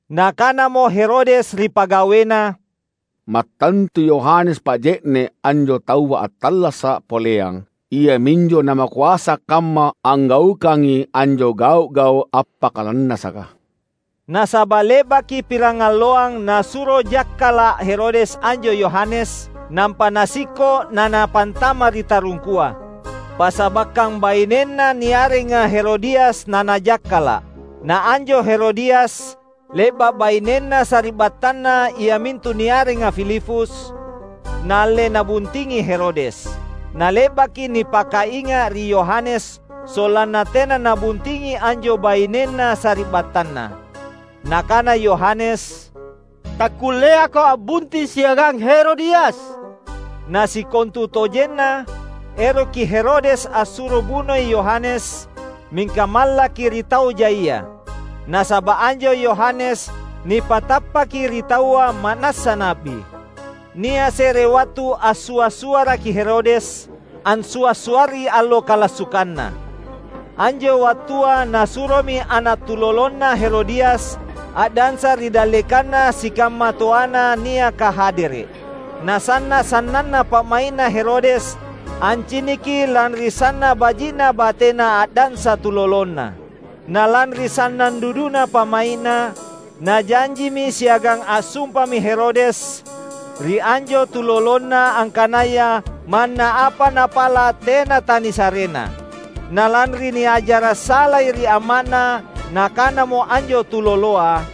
Nakanamo Herodes ri pagawena, "Mattantu Yohanes Paje’ne’ anjo taua attallasa’ poleang! Iaminjo namakoasa kamma anggaukangi anjo gau’-gau’ appakalannasaka." Nasaba’ le’baki pirangalloang nasuro jakkala’ Herodes anjo Yohanes, nampa nasikko’ na napantama’ ri tarungkua. Passabakkang bainenna niarenga Herodias nanajakkala’. Na anjo Herodias, le’ba’ bainenna sari’battanna iamintu niarenga Filipus, naalle nabuntingi Herodes. Nale’baki nipakainga’ ri Yohanes sollanna tena nabuntingi anjo bainenna sari’battanna. Nakana Yohanes, "Takkulleako a’bunting siagang Herodias!" Na sikontutojenna, eroki Herodes assuro bunoi Yohanes, mingka mallaki ri tau jaia. Nasaba’ anjo Yohanes nipatappaki ri taua ma’nassa na’bi. Nia’ se’re wattu assua’-suaraki Herodes, ansua’-suarri allo kalassukanna. Anjo wattua nasuromi ana’ tulolonna Herodias a’dansa ri dallekanna sikamma toana niaka hadere’. Nasanna’ sannanna pa’mai’na Herodes anciniki lanri sanna’ baji’na batena a’dansa tulolonna. Na lanri sannang duduna pa’mai’na, najanjimi siagang assumpami Herodes, ri anjo tulolonna angkanaya manna apa napala’ tena tanisarena. Na lanri niajara’ salai ri amma’na, nakanamo anjo tuloloa,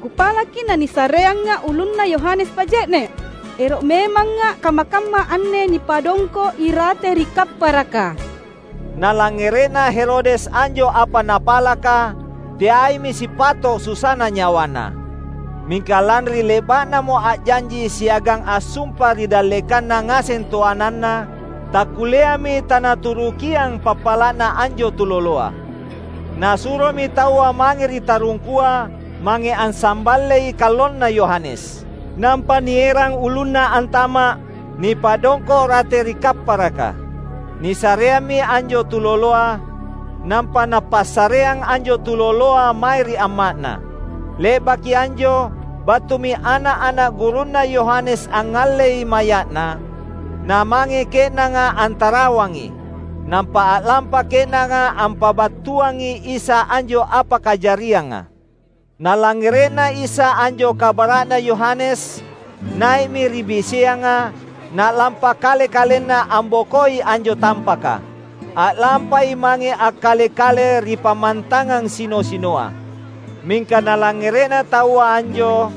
"Kupalaki nanisareanga’ ulunna Yohanes Paje’ne’. Ero’ memanga’ kamma-kamma anne nipadongko’ irate ri kapparaka!" Nalangngere’na Herodes anjo apa napalaka, teaimi sipato’ susana nyawana. Mingka lanri le’ba’namo a’janji siagang assumpa ri dallekanna ngaseng toananna, takkulleami tanaturukiang pappala’na anjo tuloloa. Nasuromi taua mange ri tarungkua, mange ansamballei kallonna Yohanes. Nampa nierang ulunna antama’, nipadongko’ rate ri kapparaka. Nisareammi anjo tuloloa; nampa napassareang anjo tuloloa mae ri amma’na. Le’baki anjo, battumi ana’-ana’ gurunna Yohanes angngallei maya’na, namange ke’nanga antarawangi. Nampa a’lampa ke’nanga ampabattuangi Isa anjo apa kajarianga. Nalangngere’na Isa anjo kabara’na Yohanes, nai’mi ri biseanga, na’lampa kale-kalenna ambokoi anjo tampaka. A’lampai mange akkale-kale ri pammantangang sino-sinoa. Mingka nalangngere’na taua anjo,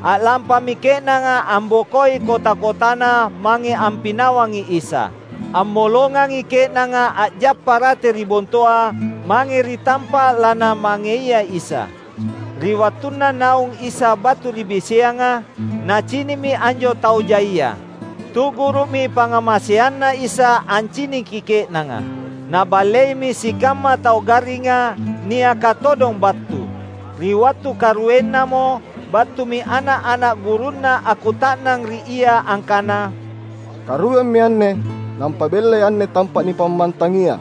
a’lampami ke’nanga ambokoi kota-kotana mange ampinawangi Isa. Ammolongangi ke’nanga a’jappa rate ri bontoa mange ri tampa’ lanamangeia Isa. Ri wattunna naung Isa battu ri biseanga, Nacini’mi anjo tau jaia. Tu’guru’mi pangngamaseanNa Isa anciniki ke’nanga. Naballeimi sikamma tau garringa, niaka todong battu. Ri wattu karuennamo, battumi ana’-ana’ gurunNa akkuta’nang ri Ia angkana, "Karuemmi anne, nampa bella anne tampa’ nipammantangia.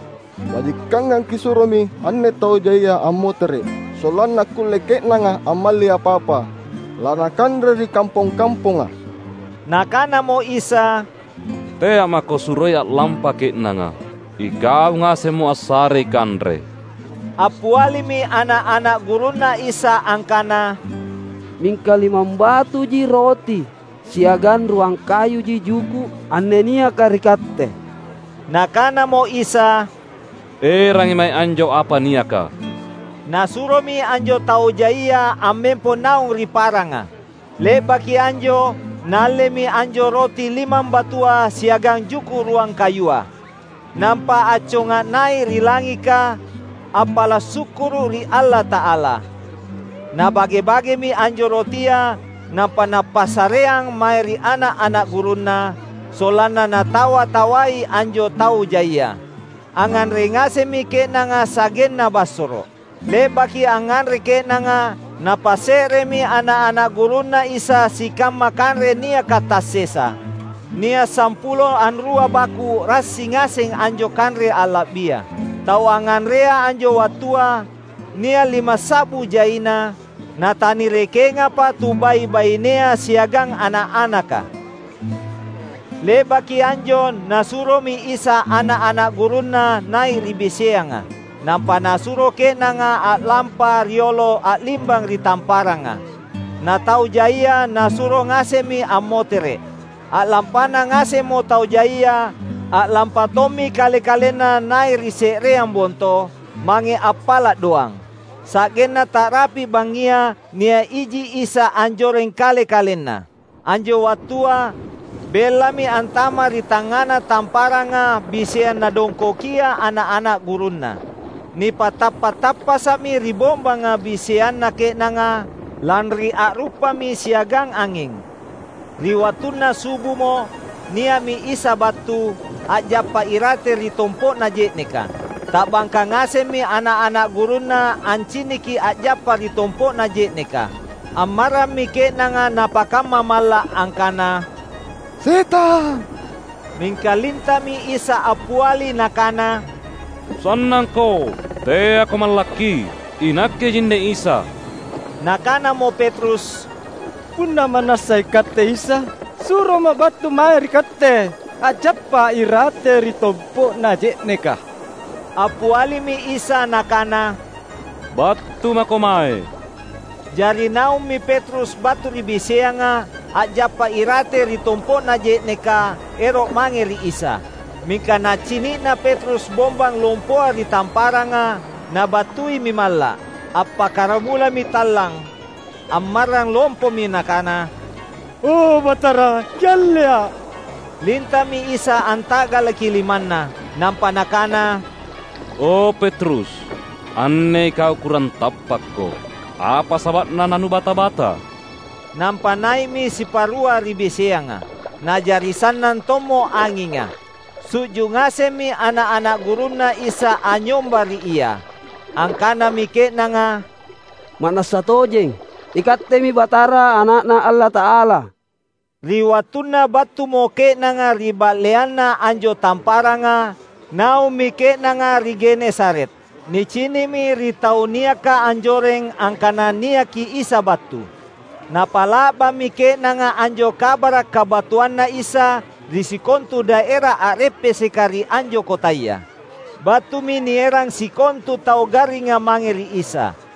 Bajikangang Kisuromi anne tau jaia ammotere’, sollanna akkulle ke’nanga ammalli apa-apa lanakanre ri kampong-kamponga." Nakanamo Isa, "Tea’ mako suroi a’lampa ke’nanga. Ikau ngasemmo assarei kanre." Appialimi ana’-ana’ gurunNa Isa angkana, "Mingka limambatuji roti siagang ruang kayuji juku’ anne niaka ri katte." Nakanamo Isa, "Erangi mae anjo apa niaka." Nasuromi anjo tau jaia ammempo naung ri paranga. Le’baki anjo, Naallemi anjo roti limambatua siagang juku’ ruang kayua. Nampa acconga nai’ ri langika, appala’ sukkuru’ ri Allata’ala. Nabage-bagemi anjo rotia, nampa Napassareang mae ri ana’-ana’ gurunNa, sollanna natawa-tawai anjo tau jaia. Angnganre ngasemmi ke’nanga sa’genna bassoro’. Le’baki angnganre ke’nanga, napasse’remi ana’-ana’ gurunNa Isa sikamma kanre niaka tassesa; nia’ sampulo anrua baku’ rassi ngaseng anjo kanre alla’bia. Tau angnganrea anjo wattua, nia’ limassa’bu jaina, natanirekengapa tubai’-bainea siagang ana’-anaka. Le’baki anjo Nasuromi Isa ana’-ana’ gurunNa nai’ ri biseanga. Nampa Nasuro ke’nanga a’lampa riolo a’limbang ri tamparanga. Na tau jaia Nasuro ngasemmi ammotere’. A’lampana ngasemmo tau jaia, a’lampa tommi Kale-kalenNa nai’ ri se’reang bonto, mange appala’ doang. Sa’genna ta’rapi’ bangngia nia’ iji Isa anjoreng Kale-kalenNa. Anjo wattua, bellami antama’ ri tangngana tamparanga biseang nadongkokia ana’-ana’ gurunNa. Nipatappa’-tappasa’mi ri bombanga biseanna ke’nanga, lanri a’ruppami siagang anging. Ri wattunna subumo, nia’mi Isa battu, a’jappa irate ri tompo’na je’neka. Ta’bangka ngasemmi ana’-ana’ gurunNa anciniki a’jappa ri tompo’na je’neka. Ammarrammi ke’nanga napakamma malla’ angkana: "Setang!" Mingka linta’mi Isa appiali Nakana: "Sannangko! Teako mallakki. INakkejinne Isa!" Nakanamo Petrus, "Punna ma’nassa iKatte Isa, suroma’ battu mae ri Katte, a’jappa irate ri tompo’na je’neka." Appialimi Isa Nakana, "Battu mako mae." Jari naummi Petrus battu ri biseanga, a’jappa irate ri tompo’na je’neka, ero’ mange ri Isa. Mingka nacini’na Petrus bombang lompoa ri tamparanga, nabattuimi malla’. Appakkaramulami tallang. Ammarrang lompomi nakana, "O Batara, Kiallea’!" Linta’mi Isa anta’galaki limanna. Nampa Nakana, "O Petrus, anne ikau kurang tappakko. Apa saba’na nanubata-bata?" Nampa nai’mi sipa’rua ri biseanga. Na’jari sannang tommo anginga. Su’ju’ ngasemmi ana’-ana’ gurunNa Isa anynyomba ri Ia. Angkanami ke’nanga, "Ma’nassa tojeng, iKattemi Batara Ana’Na Allata’ala!" Ri wattunna battumo ke’nanga ri ba’leanna anjo tamparanga, naummi ke’nanga ri Genesaret. Nicini’mi ri tau niaka anjoreng angkana niaki Isa battu. Napa’la’bammi ke’nanga anjo kabara’ kabattuanNa Isa ri sikontu daera a’reppeseka ri anjo kotaya. Battumi nierang sikontu tau garringa mange ri Isa.